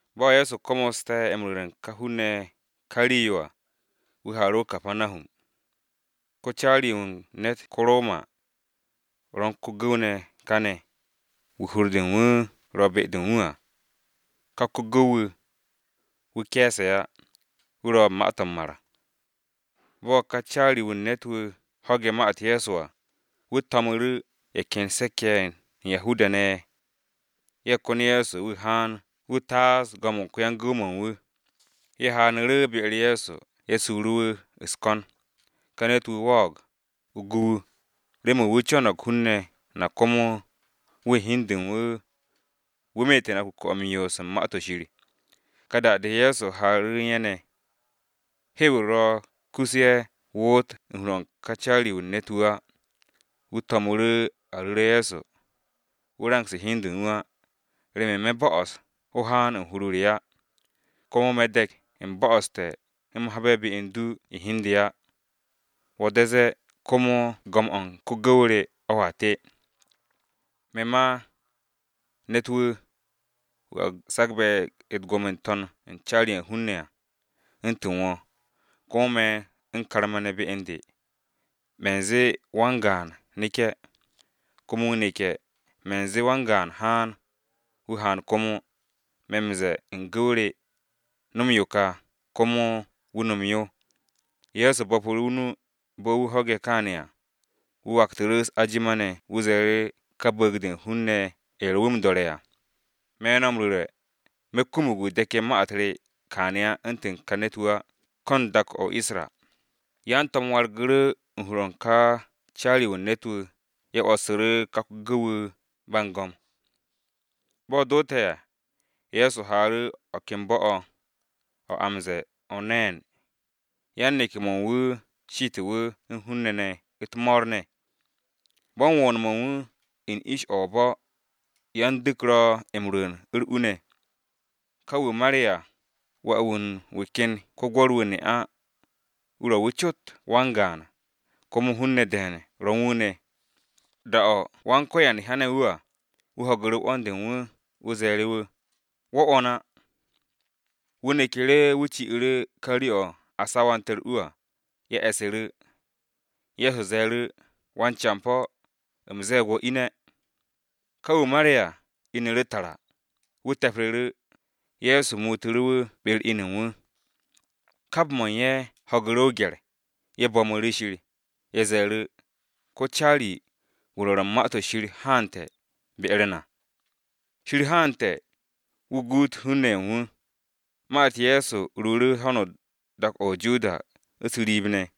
Bo̱ Ye̱so komoste̱ m-ru̱re̱ u̱n ka hun-ne̱ ye̱ ka rii-yo à, wu̱ haaru̱ o-Kapanahum. Ko-caari-wu̱ u̱n ne̱t ko-Roma, ro̱ u̱n ko-gu̱w ne̱ kane̱, wu̱ hur-de u̱n wu̱ ro̱ be-de u̱n wu̱ à, ka ko-gu̱w-wu̱, wu̱ ke̱e̱se̱ á, wu̱ ro̱ ma-to̱ m-mar. Bo̱ ka caari-wu̱ u̱n ne̱t-wu̱ ho̱ge̱ ma-u̱t Ye̱so à, wu̱ to̱mu̱ru̱ ye̱ ken se̱k-ye̱ ye̱ u̱n Yahuda-ne̱, ye̱ kon Ye̱so wu̱ haan wu̱ taas go̱m-o̱ u̱n ko-yan-gu̱w-mo̱ u̱n wu̱. Ye̱ haaru̱ be-u̱r Ye̱so ye̱ suru̱ wu̱ u̱s-ko̱n, “Ka ne̱t-wu̱ wo̱o̱g, o gu wu̱, remen wu̱ co̱no̱g hun-ne̱ na komo wu̱ u̱n hi u̱n de u̱n wu̱, wu̱ meete̱ na kuke̱-o̱ u̱n yoos u̱n Ma-to̱ Shir.” Ka da-de Ye̱so haaru̱ u̱n ye̱ ne̱. Hew-u̱r ro̱ kus a woot u̱n hur-o̱ u̱n ka caari-wu̱ u̱n ne̱t-wu̱ á, wu̱ to̱mu̱ru̱ a ru̱re̱ Ye̱so, “Go̱s-wu̱, wo̱ rangse̱ hi u̱n du á, remen me̱ bo'os o haan u̱n hur-o re á. Komo me̱ de̱k u̱m bo̱'o̱ste̱ u̱m habe̱ be u̱n du u̱n hi u̱n de á. Wo̱ de̱ no̱m u̱t-ma temb, komo go̱m-o̱ u̱n ko-gu̱w re o̱a te. Me̱ ma, ne̱t-wu̱, wu̱ a sagbe̱ u̱t-gwo̱mo n-to̱n u̱n caari-ye̱ u̱n hun-ne̱ à, u̱ntu̱n wo̱, komo me̱ u̱n karma-ne̱ be u̱n de. Me̱ m-ze̱e̱ wan-gaan, ‘Neke̱!’ Komo wu̱ neke̱. Me̱ ze̱e̱ wan-gaan ‘Haan!’ Wu̱ haan komo, me̱ m-ze̱e̱ u̱n ko-gu̱w re, ‘No̱m yo ka!’ Komo wu̱ no̱m yo.” Ye̱so bo̱pu̱ru̱ o-nu bo̱ wu̱ ho̱ge̱ kaane̱ à, wu̱ waktu̱ru̱ u̱s-ajima ne̱ wu̱ ze̱e̱ru̱ ka bu̱u̱g-de u̱n hun-ne̱ ye̱ ro̱ wu̱ m-do̱re̱ à. “Me̱ no̱ m-ru̱re̱, me̱ ro kumug wu̱ de̱ke̱ ma-u̱t re kaane̱ u̱ntu̱n ka ne̱t-wu̱ á, ko̱ u̱n dak-o o-Isra.” Yan-to̱m wargu̱ru̱ u̱n hur-o̱ u̱n ka caari-wu̱ u̱n ne̱t-wu̱, ye̱ 'wo̱ssu̱ru̱ ka ko-gu̱w-wu̱ ba u̱n go̱m. Bo̱ doote̱ à, Ye̱so haaru̱ o̱ ken bo̱-o̱, a o̱ m-ze̱e̱ o-Neen, yan-neke̱-mo̱ u̱n wu̱ shite̱ wu̱ u̱n hun-ne̱ ne̱ u̱t-mo̱o̱r ne̱. Bo̱ u̱n wo̱o̱n-mo̱ u̱n wu̱ u̱n ish o-bo̱, yan-du̱k ro̱ m-rwu̱u̱n u̱r-u ne̱. Ka wu̱ mare̱ à, wà-wu̱ u̱n wu̱ ken ko-gwo̱r-wu̱ ne'a, wu̱ ro̱ wu̱ cot wan-gaan, komo hun-ne̱ de̱e̱n ro̱ u̱n wu̱ ne̱. Da-o̱ Go̱s-wu̱ hyane̱ wu̱ à, wu̱ ho̱gu̱ru̱ 'wo̱n-de u̱n wu̱, Ye̱so ze̱e̱ru̱ wu̱, “Wo̱ 'wo̱n á!” Wu̱ neku̱ru̱ wu̱ ci'u̱ru̱ ka rii-o̱ ye̱ sawante̱ u̱r-u à, ye̱ e̱ssu̱ru̱. Ye̱so ze̱e̱ru̱, “Wan-campo̱, u̱m ze̱e̱g wo̱ ine̱!” Ka wu̱ mare̱ à, inu̱ru̱ tara, wu̱ te̱pru̱ru̱, Ye̱so muutu̱ru̱ wu̱ be-u̱r inu u̱n wu̱. Kap mo̱ u̱n ye̱ ho̱gu̱ru̱ o-gye̱r, ye̱ bo̱mu̱ru̱ Shir. Ye̱ ze̱e̱ru̱, “Ko-caari-wu̱ u̱n wan-Rwo̱r u̱n Ma-to̱ Shir haante̱ be-u̱r na! Shir haante̱ wu̱ guut hun-ne̱ ye̱ u̱n wu̱.” Ma-u̱t Ye̱so ruuru̱ ho̱no dak-o̱ o-Judiya u̱s-riib ne̱.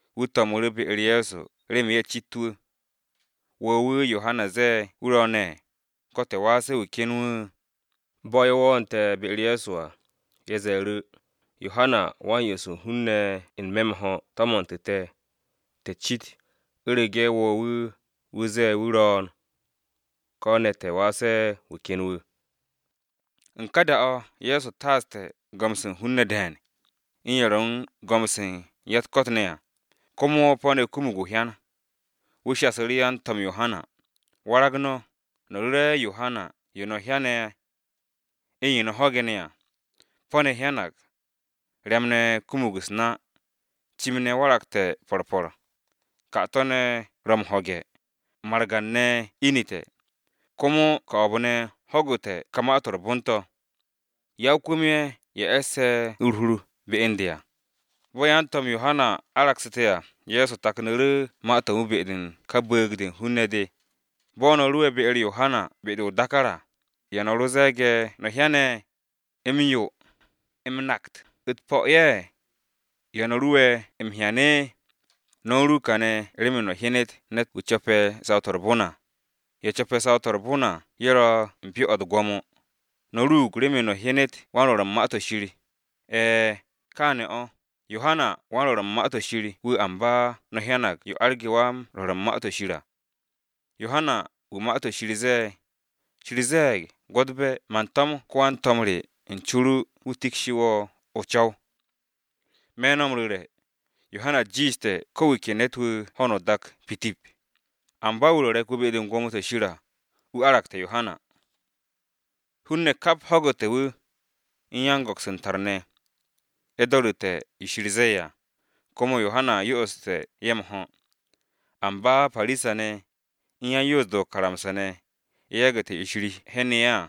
Wu̱ to̱mu̱ru̱ ye̱ be-u̱r Ye̱so remen ye̱ cit wu̱: “¿Wo̱ wu̱ Yohana ze̱e̱ wu̱ ro̱o̱ne̱, ko̱ te̱ waase̱ wu̱ ken wu̱?” Bo̱ ye̱ wo̱o̱nte̱ be-u̱r Ye̱so à, ye̱ ze̱e̱ru̱, “Yohana Wa-m-Yo'os u̱n hun-ne̱ m-ho̱ tomontu̱ te̱, te̱ cit u̱rege̱ ¿wo̱ wu̱, wu̱ zee wu̱ ro̱o̱n, ko̱ ne̱ te̱ waase̱ wu̱ ken wu̱?” U̱n ka da-o̱, Ye̱so taaste̱ go̱m-se u̱n hun-ne̱ de̱e̱n, u̱n ye̱ ro̱ u̱n go̱m-se u̱n ya-u̱t-ko̱t ne̱ à, komo po̱-ne̱ kumug o-hyan. Wu̱ shasu̱ru̱ yan-to̱m Yohana, “Warag no̱, no̱ ru̱re̱ Yohana yo no̱ hyane̱, u̱n yo no̱ ho̱ge̱ ne̱ à: Po̱-ne̱ hyanag, ryam-ne̱ kumug u̱s-na, cim-ne̱ waragte̱ po̱r po̱r, 'kato̱-ne̱ ro̱ m-ho̱ge̱, margan-ne̱ inu̱te̱, komo ko̱o̱b-ne̱ ho̱gu̱te̱ ka Ma-to̱ m-Re̱re̱m to̱. Ya-o-kwu̱m-ye̱, ye̱ e̱sse̱ u̱r-hur be u̱n de à.” Bo̱ yan-to̱m Yohana aragsu̱te̱ à, Ye̱so taknu̱ru̱ ma-to̱ u̱n wu̱ be-de u̱n ka bu̱u̱g-de u̱n hun-ne̱ de. “Bo̱ no̱ ruwe̱ be-u̱r Yohana be-de o-dákár à, ¿ya no̱ ro ze̱e̱ge̱ no̱ hyen? ¿M-yó, m-nakt u̱t-po̱ ye̱? ¿Ya no̱ ruwe̱ m-hyane̱? No̱ u̱n ru kane̱ remen no̱ hyenet ne̱t-wu̱ co̱pe̱ saw-to̱ u̱r-bon à. Ye̱ co̱pe̱ saw-to̱ u̱r-bon à ye̱ ro̱ u̱n pyo-o̱ u̱t-gwo̱mo! No̱ ruug remen no̱ hyenet wan-rwo̱r u̱n Ma-to̱ Shir. E̱e̱, kaane̱ o̱, Yohanawan-Rwo̱r u̱n Ma-to̱ Shir wu̱ amba no̱ hyanag yo arge̱ wan-Rwo̱r u̱n Ma-to̱ Shir à. Yohana wu̱ Ma-to̱ Shir ze̱e̱, ‘Shir ze̱e̱g, gwo̱tbe̱ man to̱m wan-to̱m re u̱n co ru wu̱ tikshi wo̱ o-co̱w.’ Me̱ no̱ m-ru̱re̱, Yohana jiishte̱ ko̱ wu̱ ke ne̱t-wu̱ ho̱no o-dak pitip. Amba wu̱ ro̱ re̱k-wu̱ be-de u̱n gwo̱mo-to̱ Shir à, wu̱ aragte̱ Yohana.” Hun-ne̱ kap ho̱gu̱te̱ wu̱, u̱n yan-go̱ks u̱n tar-ne̱. Ye̱ do̱ru̱te̱ yo Shir ze̱e̱ à, komo Yohana yo'oste̱ ye̱ m-ho̱. Amba Parisa-ne̱, u̱n yan-Napse̱ o-karamsa ne̱, ye̱ yagu̱te̱ yo Shir hyenu̱ ye̱ à,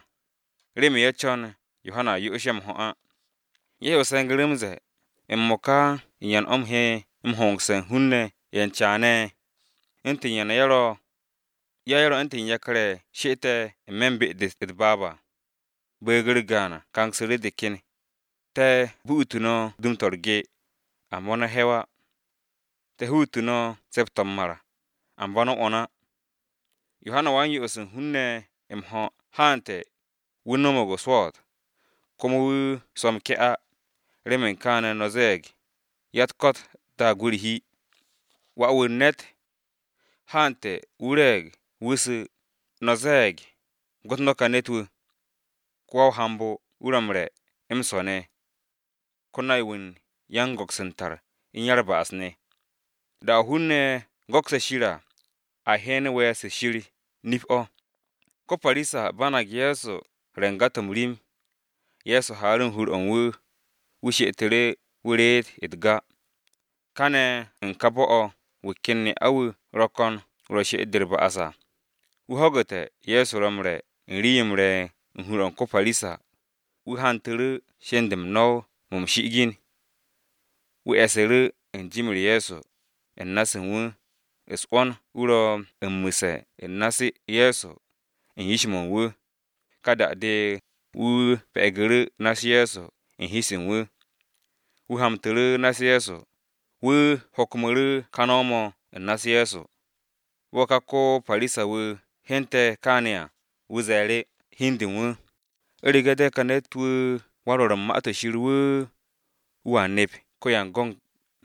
remen ye̱ co̱n Yohana yo'os ye̱ m-ho̱ á. Ye̱so se̱ngu̱ru̱ m-ze̱e̱, “M-mo̱ka u̱n ¿yan o̱ u̱m he m-hongse̱ u̱n hun-ne̱ ye̱ u̱n caane̱? ¿U̱ntu̱n yan ye̱ ro̱? Ya ye̱ ro̱ u̱ntu̱n yakar-ye̱ she'ete̱ n-me̱ u̱n be-de u̱t-baab à. Bu̱u̱g-u̱r gaan kangsu̱ru̱ de ken. “ ‘Te̱ bu'utu no̱ dum-to̱ u̱r-ge, amba no̱ he̱w á! Te̱ hutu̱ no̱ se̱p-to̱ m-mar, amba no̱ 'wo̱n á!’ Yohana Wa-m-Yo'os u̱n hun-ne̱ m-ho̱ haante̱, wu̱ no̱mo̱g o-swo̱o̱t, komo wu̱ swo̱ m-ke̱ á, remen kaane̱ no̱ ze̱e̱g, ‘Ya-u̱t-ko̱t daag wu̱ u̱r-hi.’ Wà-wu̱ u̱n ne̱t haante̱, wu̱ re̱e̱g, wu̱ su̱, no̱ ze̱e̱g, ‘Gwo̱t no̱ ka ne̱t-wu̱! Ko wa-o-hambo wu̱ m-re̱, m-swo̱ ne̱, ko-nay-wu̱ u̱n yan-go̱ks u̱n tar, u̱n ya-u̱r-ba'as ne̱.’ Da-o̱ hun-ne̱ go̱kse̱ Shir à, a hyen we̱e̱r-se u̱n Shir, nip-o̱.” Ko-Parisa banag Ye̱so re̱ u̱n ga-to̱ m-rim, Ye̱so haaru̱ u̱n hur-o̱ u̱n wu̱, wu̱ she'etu̱ru̱ wu̱ reet u̱t-ga. Kane̱ u̱n ka bo̱-o̱ wu̱ ken ne'a-wu̱ ro̱ ko̱n wu̱ ro u̱n she'et-de u̱r-ba'as à. Wu̱ ho̱gu̱te̱ Ye̱so ro̱ m-re̱ u̱n rii-yo m-re̱ u̱n hur-o̱ u̱n ko-Parisa, wu̱ hantu̱ru̱ u̱r-batta de u̱n no̱w-mo̱ m-shi'igin mo̱ u̱n hwo̱r de̱e̱n. Wu̱ e̱su̱ru̱ u̱n jim-u̱r Ye̱so, u̱n na-se u̱n wu̱, u̱s-'wo̱n wu̱ ro̱ m-mu̱se̱ u̱n na-u̱s Ye̱so u̱n yish-mo̱ u̱n wu̱. Ka da-de wu̱ pe̱gu̱ru̱ na-u̱s Ye̱so u̱n hi-se u̱n wu̱, wu̱ hamtu̱ru̱ na-u̱s Ye̱so, wu̱ hokmo̱ru̱ ka no̱w-mo̱ u̱n na-u̱s Ye̱so. Bo̱ ka ko-Parisa-wu̱ hyente̱ kaane̱ à, wu̱ ze̱e̱ru̱ hi u̱n de u̱n wu̱, “U̱rege̱ de ka ne̱t-wu̱ wan-rwo̱r u̱n Ma-to̱ Shir wu̱, wu̱a nep ko-yan-go̱n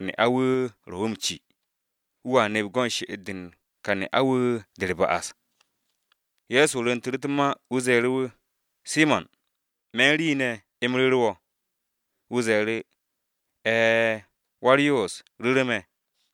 ne'a-wu̱ ro̱ wu̱ m-ci, wu̱a nep go̱n she'et-de u̱n ka ne'a-wu̱ de u̱r-ba'as!” Ye̱so rwu̱ntu̱ru̱ u̱t-ma wu̱ ze̱e̱ru̱ wu̱, “Simo̱n, me̱ u̱n rii ne̱ u̱m ru̱ru̱ wo̱.” Wu̱ ze̱e̱ru̱, “E̱e̱, Wa-u̱r-Yoos, ru̱ru̱ me̱.”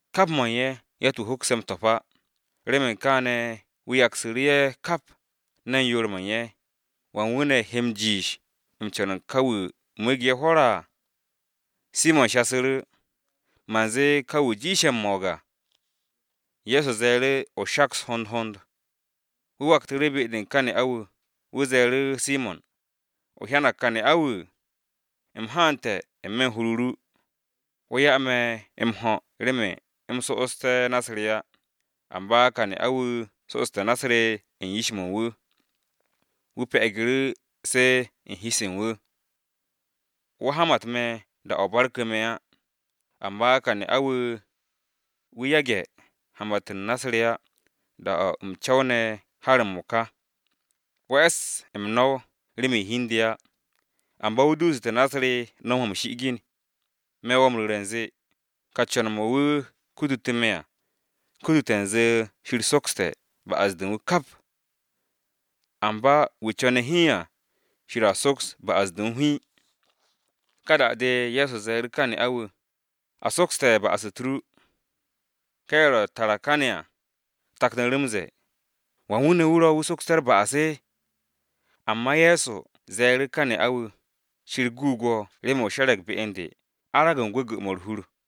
Kap mo̱ u̱n ye̱ yatt-wu̱ hokse̱ m-to̱p á, remen kaane̱ wu̱ yaksu̱ru̱ ye̱ kap, ne̱n yoor mo̱ u̱n ye̱, ¿wan wu̱ ne̱ he m-jiish m-co̱n u̱n ka wu̱ mu̱u̱ge̱ ye̱ hwo̱r?” Simo̱n shasu̱ru̱, “Man zee ka wu̱ jiishe̱ m-mo̱o̱g à.” Ye̱so ze̱e̱ru̱, “O shaks hond hond.” Wu̱ waktu̱ru̱ be-de u̱n ka ne'a-wu̱, wu̱ ze̱e̱ru̱ Simo̱n, “¿O hyanag ka ne'a-wu̱? U̱m haante̱ n-me̱ u̱n hur-o ru, wo̱ 'ya me̱ m-ho̱ remen u̱m so'osté̱ na-u̱s re á, amba ka ne'a-wu̱ so'oste̱ na-u̱s re u̱n yish-mo̱ u̱n wu̱, wu̱ pe̱gu̱ru̱ se u̱n hi-se u̱n wu̱. Wo̱ hamat me̱ da-o̱ o barku̱ me̱ á, amba ka ne'a-wu̱, wu̱ yage̱ hamat u̱n na-u̱s re á, da-o̱ u̱m co̱wne̱ har m-mo̱ka. Wo̱ e̱s m-no̱w remen hi u̱n de á, amba wu̱ duusu̱te̱ na-u̱s re m-no̱w mo̱ m-shi'igin. Me̱ wo̱ m-ru̱re̱ u̱nze, ka co̱n-mo̱, mo̱ wu̱ kutu̱ me̱ à, kutute̱ u̱nze Shir sokste̱ ba'as-de u̱n wu̱ kap. Amba wu̱ co̱ne̱ hiin à, Shir a soks ba'as-de u̱n wu̱ hiin.” Ka da-de Ye̱so ze̱e̱ru̱ ka ne'a-wu̱, “A sokste̱ ba'as-u̱t ru.” Ka ye̱ ro tara kane̱ à, taknu̱ru̱ m-ze̱e̱, “¿Wan wu̱ ne̱ wu̱ ro̱, wu̱ sokste̱ u̱r-ba'as?” Amba Ye̱so ze̱e̱ru̱ ka ne'a-wu̱, “Shir guug wo̱ remen o she̱re̱g be u̱n de, arag u̱n gwu̱gwu̱-mo̱ u̱r-hur.”